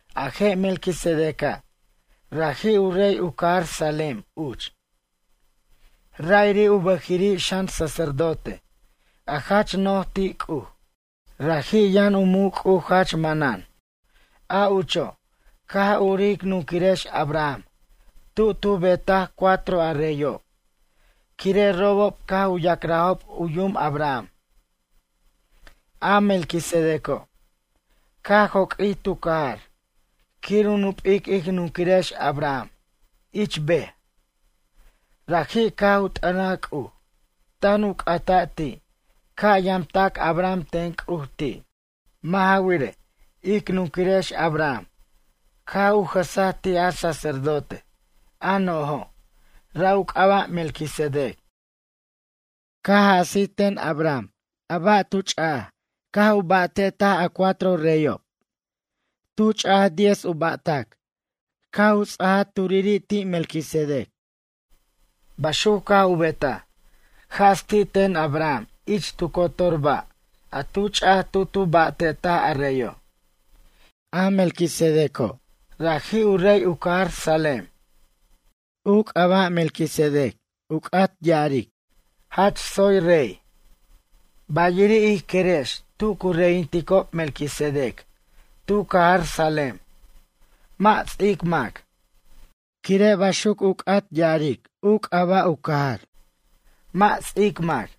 A je' Melquisedeca', raji' u rey u cajar Salem uch. Ra'iri' u bʌjiri' xan sacerdote a jach no'j ti' C'uj. Raji' yʌn u muc' C'uj jach manan. A ucho' caj urij ic nunquirex Abraham tu tu ba'tetaj cuatro a reyob, quire' robob caj u ya'crajob u yum Abraham. A Melquisedeco', caj joq'uij tu cajar quir u nup'ic ic nunquirex Abraham ich ber. Raji' caj u t'ʌnaj C'uj tan u c'ata' ti' ca' yamtac Abraham ten C'uj ti'. Mʌ' ja wirej, ic nunquirex Abraham caj u jʌsaj ti' a sacerdote, a no'jo', ra' u c'aba' Melquisedec. Caj jasij ten Abraham a ba' tu ch'aj caj u ba'tetaj a cuatro reyob. Tu tu ch'aj diez u ba'tʌc caj u ts'aja turiri' ti' Melquisedec. Baxuc caj u betaj, jas ti' ten Abraham ich tu cotor ba' a tu ch'aj tu tu ba'tetaj a reyo'. A Melquisedec raji' u rey u cajar Salem. U c'aba' Melquisedec u c'at ya'arej: “Jach tsoy rey.” Bayiri' ij querex tu cu reyinticob Melquisedec tu cajar Salem mʌ' ts'ic mac, quire' baxuc u c'at ya'arej u c'aba' u cajar: “Mʌ' ts'ic mac.”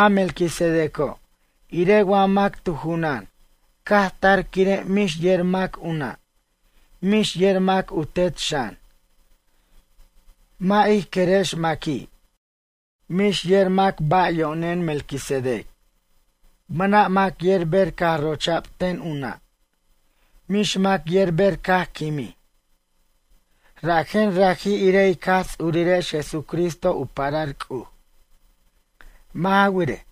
A Melquisedeco' irej wa mac tu junan caj tar quire' mix yer mac u nʌ', mix yer mac u tet xan. Mʌ' ij querex maqui'. Mix yer mac ba' yo'nen Melquisedec. Mʌna' mac yer ber caj rocha'b ten u nʌ', mix mac yer ber caj quimij. Rajen raji' irej ic Jaj Ts'urirex Jesucristo u parar C'uj. Mʌ' ja wirej,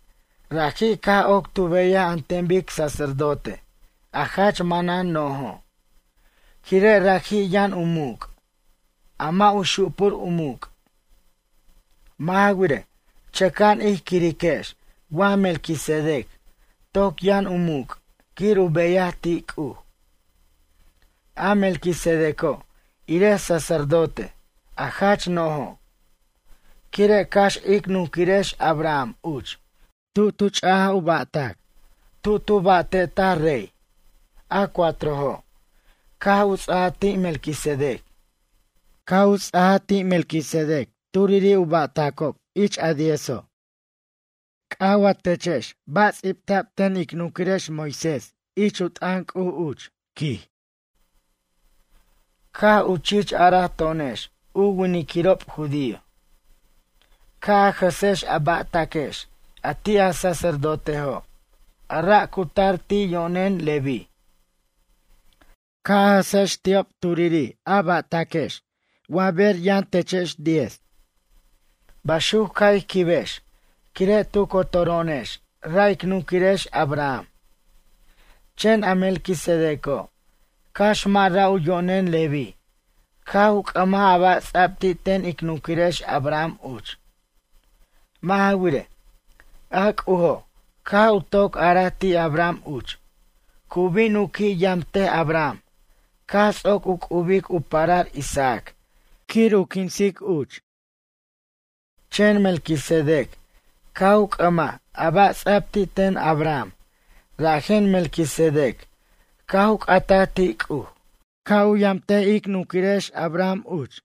raji' caj oc tu beyaj an ten bic sacerdote a jach manan no'jo', quire' raji' yʌn u muc', a mʌ' u xupur u muc'. Mʌ' ja wirej, chʌca'an ij quiriquex wa Melquisedec toc yʌn u muc' quir u beyaj ti' C'uj. A Melquisedeco' irej sacerdote, a jach no'jo'. Quire' cax ic nunquirex Abraham uch tu tu ch'aj u ba'tac tu tu ba'te'taj rey, a cuatrojo', caj u ts'aja ti' Melquisedec. Caj u ts'aja ti' Melquisedec turiri' u ba'taco' ich a diezo'. C'aj wa techex ba' ts'ibta'b ten ic nunquirex Moisés ich u t'ʌn C'uj uch, quij. Caj u chich araj to'onex u winiquirob judío: “Ca' a jʌsex a ba'taquex a ti' a sacerdotejo' a ra' cu tar ti' yo'nen Leví. Ca' a jʌsex ti'ob turiri' a ba'taquex wa ber yʌnechex diez.” Baxuc ca' ij quibex quire' tu cotoro'onex ra' ic nunquirex Abraham. Chen a Melquisedeco', cax mʌ' ra' u yo'nen Leví caj u c'ʌmaj a ba' ts'ab ti' ten ic nunquirex Abraham uch. Mʌ' ja wirej, a C'ujo' caj u toc araj ti' Abraham uch, cu bin u qui' yamtej Abraham caj ts'oc u c'ubic u parar Isaac quir u quinsac uch. Chen Melquisedec caj u c'ʌmaj a ba' ts'a'b ti' ten Abraham rajen Melquisedec caj u c'ataj ti' C'uj ca' u yamt ic nunquirex Abraham uch.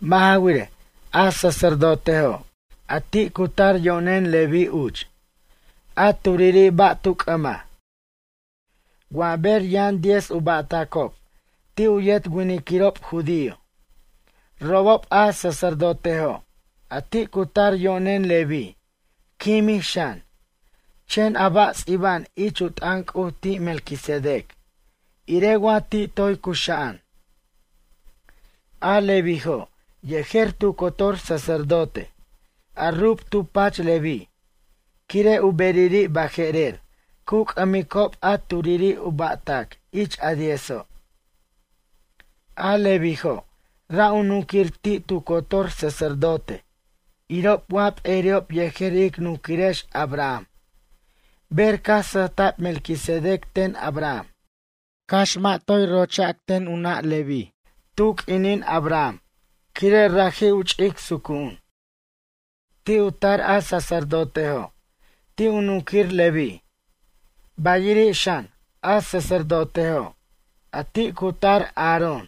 Mʌ' ja wirej, a sacerdotejo', a ti' cu tar yo'nen Leví uch, a turiri' ba' tu c'ʌmaj, wa ber yʌn diez u ba'tacob ti' u yet winiquirob judío. Robob a sacerdotejo', a ti' cu tar yo'nen Leví, quimij xan, chen a ba' ts'iba'an ich u t'ʌn C'uj ti' Melquisedec irej wa ti' toy cuxa'an. A Levíjo' yejer tu cotor sacerdote, a rub tu pach Leví, quire' u beriri' baje'rer cu c'ʌmicob a turiri' u ba'tac ich a diezo'. A Levíjo' ra' u nunquir ti' tu cotor sacerdote irob wa p'eri'ob yejer ic nunquirex Abraham ber caj sʌjta'b Melquisedec ten Abraham, cax mʌ' toy rocha'b ten u nʌ' Leví tu q'uinin Abraham, quire' raji' u ch'ic sucu'un. Ti' u tar a sacerdotejo', ti' u nunquir Leví, bayiri' xan, a sacerdotejo', a ti' cu tar Aarón,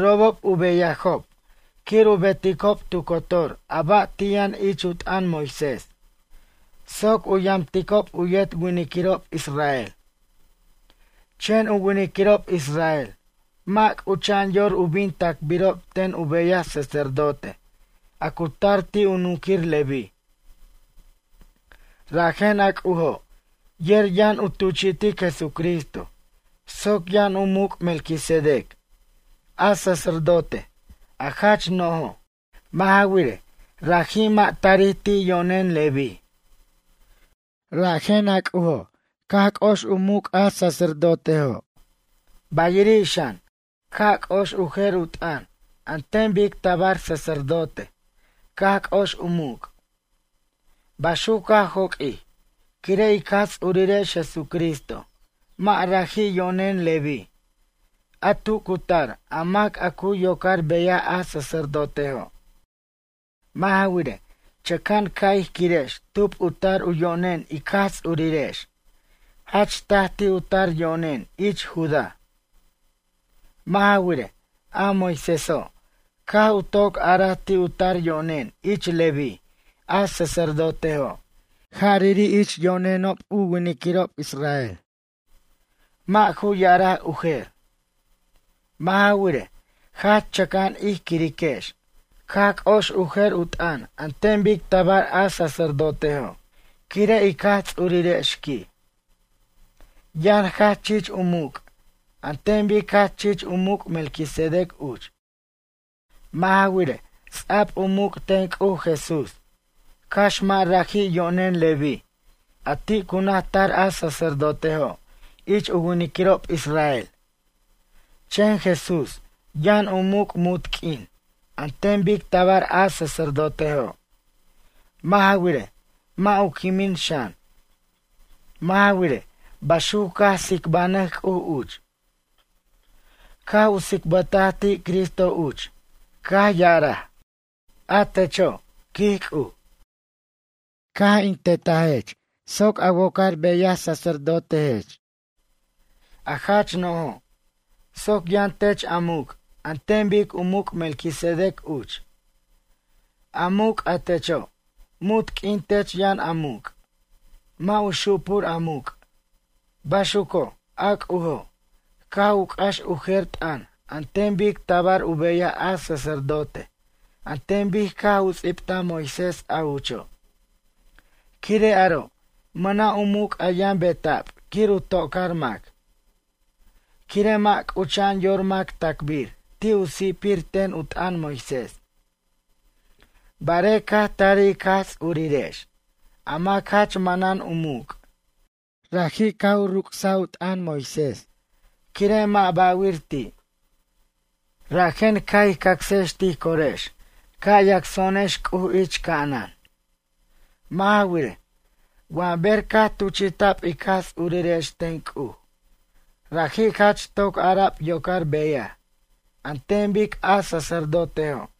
robob u beyajob quir u beticob tu cotor a ba' ti' yʌn ich u t'ʌn Moisés soc u yamticob u yet winiquirob israel. Chen u winiquirob israel mʌ' c'ucha'an yor u bin tacbirob ten u beyaj sacerdote a cu tar ti' u nunquir Leví. Rajen a C'ujo' yer yʌn u tuchi'tic Jesucristo soc yʌn u muc' Melquisedec, a sacerdote a jach no'jo'. Mʌ' ja wirej, raji' mʌ' tarij ti' yo'nen Leví. Rajen a C'ujo' caj c'ox u muc' a sacerdotejo', bayiri' xan, ca' c'ox u jer u t'ʌn an ten bic tabar sacerdote caj c'ox u muc'. Baxuc caj joq'uij, quire' ic Jaj Ts'urirex Jesucristo mʌ' raji' yo'nen Leví, a tu cu tar a mac a cu yocar beyaj a sacerdotejo'. Mʌ' ja wirej, chʌca'an ca' ij quirex tub u tar u yo'nen ic Jaj Ts'urirex, jach taj ti' u tar yo'nen ich Judá. Mʌ' ja wirej, a Moiséso' caj u toc araj ti' u tar yo'nen ich Leví a sacerdotejo', jariri' ich yo'nenob u winiquirob israel. Mʌ' ju ya'araj u jer. Mʌ' ja wirej, jach chʌca'an ij quiriquex caj c'ox u jer u t'ʌn an ten bic tabar a sacerdotejo', quire' ic Jaj Tsurirex quij, yʌn jach chich u muc' an ten bic jach chich u muc' Melquisedec uch. Mʌ' ja wirej, ts'a'b u muc' ten C'uj Jesús, cax mʌ' raji' yo'nen Leví a ti' cu naj tar a sacerdotejo' ich u winiquirob israel. Chen Jesús yʌn u muc' munt q'uin an ten bic tabar a sacerdotejo'. Mʌ' ja wirej, mʌ' u quimin xan. Mʌ' ja wirej, baxuc caj tsicbanʌj C'uj uch, caj u tsicbʌtaj ti' Cristo uch caj ya'araj: A techo', quij C'uj, caj in tetatech soc a wocar beyaj sacerdotejech, a jach no'jo', soc yʌn tech a muc' an ten bic u muc' Melquisedec uch. A muc' a techo', munt q'uin tech yʌn a muc'. Mʌ' u xupur a muc'. Baxuco', a C'ujo' caj u c'ax u jer t'ʌn an ten bic tabar u beyaj a sacerdote an ten bic caj u ts'ibtaj Moisés a ucho', quire' aro' mʌna' u muc' a yʌn beta'b quir u tocar mac. Quire' mʌ' c'ucha'an yor mac tacbir ti' u si'pir ten u t'ʌn Moisés. Barej caj tarij ic Jaj Ts'urirex, a mac jach manan u muc', raji' caj u ruc's u t'ʌn Moisés quire' mʌ' ba'wir ti'. Rajen ca' ij cacsex tij corex ca' yacso'onex C'uj ich ca'anan. Mʌ' ja wirej, wa ber caj tuchi'ta'b ic Jaj Ts'urirex ten C'uj, raji' jach toc ara'b yocar beyaj an ten bic a sacardotejo'.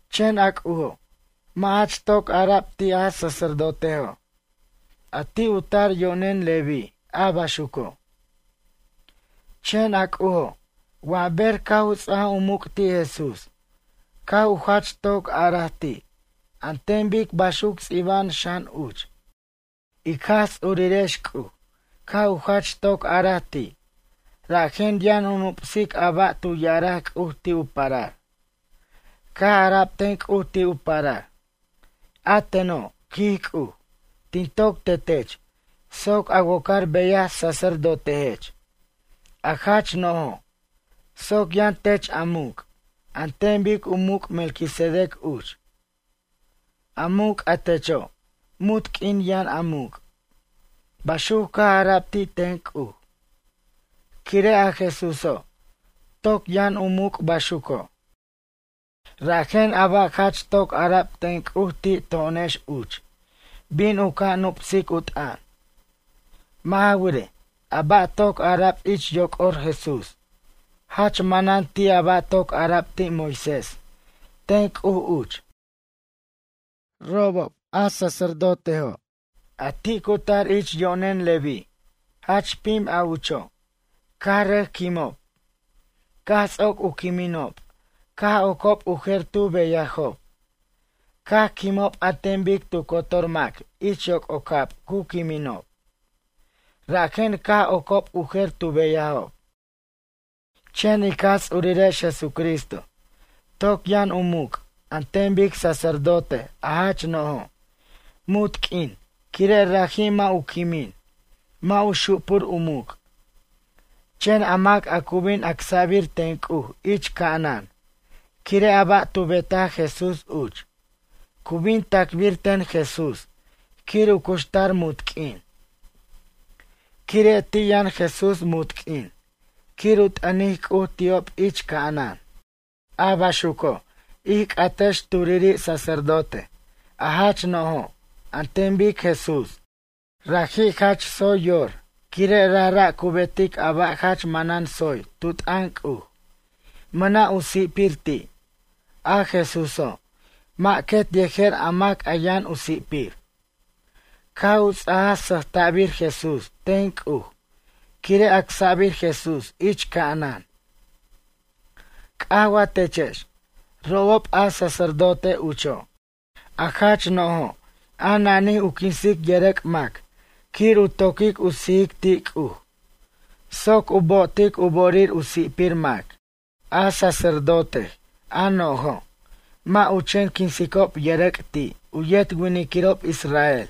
Chen a C'ujo' mʌ' jach toc ara'b ti' a sacerdotejo' a ti' u tar yo'nen Leví a baxuco'. Chen a C'ujo', wa ber caj u ts'ajaj u muc' ti' Jesús caj u jach toc araj ti' an ten bic baxuc ts'iba'an xan uch. Ic Jaj Ts'urirex C'uj caj u jach toc araj ti' rajen yʌn u nup'sic a ba' tu ya'araj C'uj ti' u parar. Caj ara'b ten C'uj ti' u parar: A teno', quij C'uj, tin toc tetech soc a wocar beyaj sacerdotejech, a jach no'jo', soc yʌn tech a muc' an ten bic u muc' Melquisedec uch. A muc' a techo', munt q'uin yʌn a muc'. Baxuc caj ara'b ti' ten C'uj. Quire' a Jesúso', toc yʌn u muc' baxuco', rajen a ba' jach toc ara'b ten C'uj C'uj ti' to'onex uch bin u ca' nup'sic u t'ʌn. Mʌ' ja wirej, a ba' toc ara'b ich yoc'or Jesús jach manan ti' a ba' toc ara'b ti' Moisés ten C'uj uch. Robob, sacerdotejo', quij, a ti' cu tar ich yo'nen Leví jach pim a ucho', caj rʌc quimob. Caj ts'oc u quiminob caj oc'ob u jer tu beyajob. Caj quimob an ten bic tu cotor mac ich yoc'ocab cu quiminob, rajen caj oca'b u jer tu beyajob. Chen ic Jaj Ts'urirex Jesucristo toc yʌn u muc' an ten bic sacerdote a jach no'jo', munt q'uin quire' raji' mʌ' u quimin. Mʌ' u xupur u muc'. Chen a mac a cu bin acsa'bir ten C'uj ich ca'anan quire' a ba' tu betaj Jesús uch, cu bin tacbir ten Jesús quir u cuxtar munt q'uin. Quire' ti' yʌn Jesús munt q'uin quir u t'ʌnic C'uj ti'ob ich ca'anan. A baxuco', ij c'atex turiri' sacerdote, a jach no'jo' an ten bic Jesús. Raji' jach tsoy yor quire' rajra' cu betic a ba' jach manan soy tu t'ʌn C'uj, mʌna' u si'pir ti', A Jesúso' mʌ' quet yejer a mac a yʌn u si'pir. Caj u ts'ajaj sʌjta'bir Jesús ten C'uj quire' acsa'bir Jesús ich ca'anan. C'aj wa techex, robob a sacerdote ucho', a jach no'jo' a nanij u quinsic yʌrʌc' mac quir u to'quic u sijic ti' C'uj soc u bo'otic u bo'orir u si'pir mac. A sacerdotej a no'jo', mʌ' u chen quinsicob yʌrʌc' ti' u yet winiquirob israel,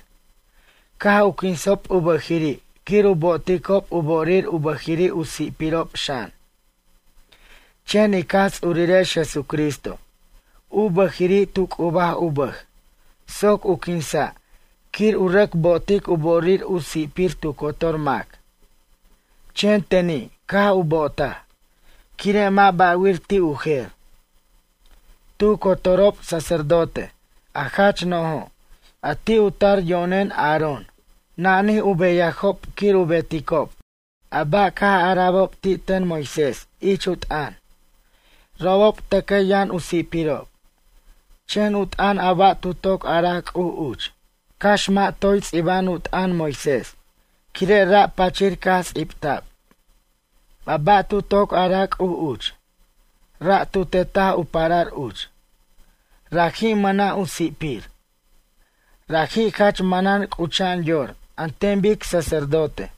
caj u quinsob u bʌjiri' quir u bo'oticob u bo'orir u bʌjiri' u si'pirob xan. Chen ic Jaj Ts'urirex Jesucristo, u bʌjiri' tu c'ubaj u bʌj soc u quinsa' quir u rʌc bo'otic u bo'orir u si'pir tu cotor mac. Chen teni' caj u bo'otaj, quire' mʌ' ba'wir ti' u jer. Tu cotorob sacerdote a jach no'jo', a ti' u tar yo'nen Aarón nanij u beyajob quir u beticob a ba' caj ara'bob ti' ten Moisés ich u t'ʌn. Robob tʌcʌ yʌn u si'pirob. Chen u t'ʌn a ba' tu toc araj C'uj uch, cax mʌ' toy ts'iba'an u t'ʌn Moisés, quire' ra' pachir caj ts'ibta'b. A ba' tu toc araj C'uj uch, ra' tu tetaj u parar uch. Raji' mʌna' u si'pir. Raji' jach manan c'ucha'an yor an ten bic sacerdote.